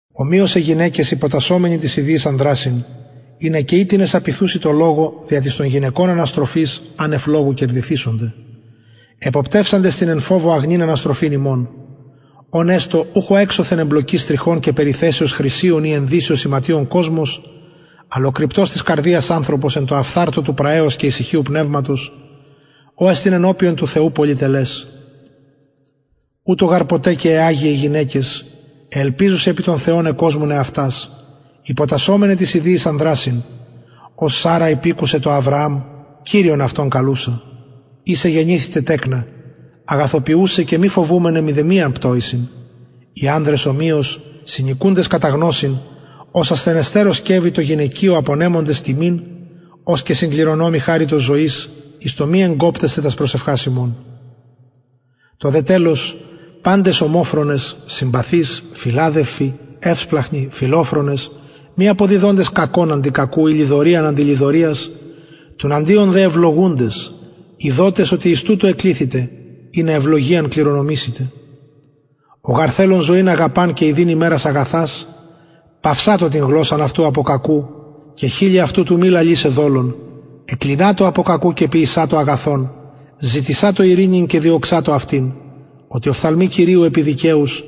ομοιως αι γυναικες υποτασσομεναι τοις ιδιοις ανδρασιν ινα και ει τινες απειθουσιν τω λογω δια της των γυναικων αναστροφης ανευ λογου κερδηθησονται εποπτευσαντες την εν φοβω αγνην αναστροφην υμων ων εστω ουχ ο εξωθεν εμπλοκης τριχων και περιθεσεως χρυσιων η ενδυσεως ιματιων κοσμος αλλ ο κρυπτος της καρδιας ανθρωπος εν τω αφθαρτω του πραεος και ησυχιου πνευματος ο εστιν ενωπιον του θεου πολυτελες ουτως γαρ ποτε και αι αγιαι γυναικες αι ελπιζουσαι επι θεον εκοσμουν εαυτας υποτασσομεναι τοις ιδιοις ανδρασιν ως σαρρα υπηκουσεν τω αβρααμ κυριον αυτον καλουσα ης εγενηθητε τεκνα αγαθοποιουσαι και μη φοβουμεναι μηδεμιαν πτοησιν οι ανδρες ομοιως συνοικουντες κατα γνωσιν ως ασθενεστερω σκευει τω γυναικειω απονεμοντες τιμην ως και συγκληρονομοι χαριτος ζωης εις το μη εγκοπτεσθαι τας προσευχας υμων το δε τελος παντες ομοφρονες συμπαθεις φιλαδελφοι ευσπλαγχνοι φιλοφρονες μη αποδιδοντες κακον αντι κακου η λοιδοριαν αντι λοιδοριας τουναντιον δε ευλογουντες ειδοτες οτι εις τουτο εκληθητε ινα ευλογιαν κληρονομησητε ο γαρ θελων ζωην αγαπαν και ιδειν ημερας αγαθας παυσατω την γλωσσαν αυτου απο κακου και χειλη αυτου του μη λαλησαι δολον εκκλινατω απο κακου και ποιησατω αγαθον ζητησατω ειρηνην και διωξατω αυτην οτι οφθαλμοι κυριου επι δικαιους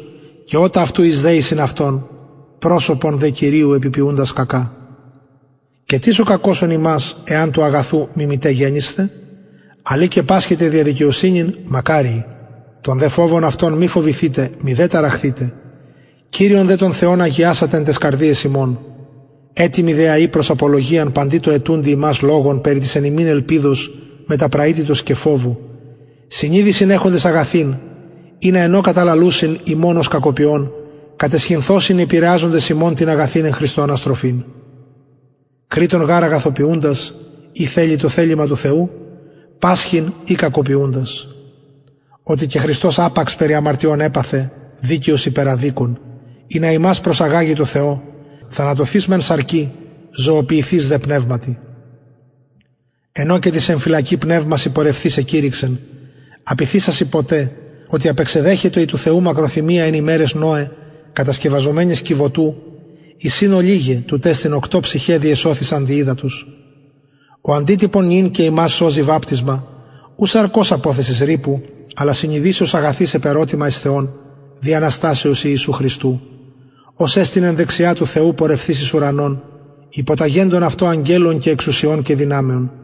και ωτα αυτου εις δεησιν αυτων προσωπον δε κυριου επι ποιουντας κακα και τις ο κακωσων υμας εαν του αγαθου μιμηται γενησθε αλλ ει και πασχοιτε δια δικαιοσυνην μακαριοι τον δε φοβον αυτων μη φοβηθητε μηδε ταραχθητε κυριον δε τον θεον αγιασατε εν ταις καρδιαις υμων ετοιμοι δε αει προς απολογιαν παντι τω αιτουντι υμας λογον περι της εν υμιν ελπιδος μετα πραυτητος και φοβου συνειδησιν εχοντες αγαθην ινα εν ω καταλαλουσιν υμων ως κακοποιων καταισχυνθωσιν οι επηρεαζοντες υμων την αγαθην εν χριστω αναστροφην κρειττον γαρ αγαθοποιουντας ει θελοι το θελημα του θεου πασχειν η κακοποιουντας οτι και χριστος απαξ περι αμαρτιων επαθεν δικαιος υπερ αδικων ινα υμας προσαγαγη τω θεω θανατωθεις μεν σαρκι ζωοποιηθεις δε πνευματι εν ω και τοις εν φυλακη πνευμασιν πορευθεις εκηρυξεν απειθησασιν ποτε οτε απεξεδεχετο η του θεου μακροθυμια εν ημεραις νωε κατασκευαζομενης κιβωτου εις ην ολιγαι τουτ εστιν οκτω ψυχαι διεσωθησαν δι υδατος ο αντιτυπον νυν και ημας σωζει βαπτισμα ου σαρκος αποθεσις ρυπου αλλα συνειδησεως αγαθης επερωτημα εις θεον δι αναστασεως ιησου χριστου ος εστιν εν δεξια του θεου πορευθεις εις ουρανον υποταγεντων αυτω αγγελων και εξουσιων και δυναμεων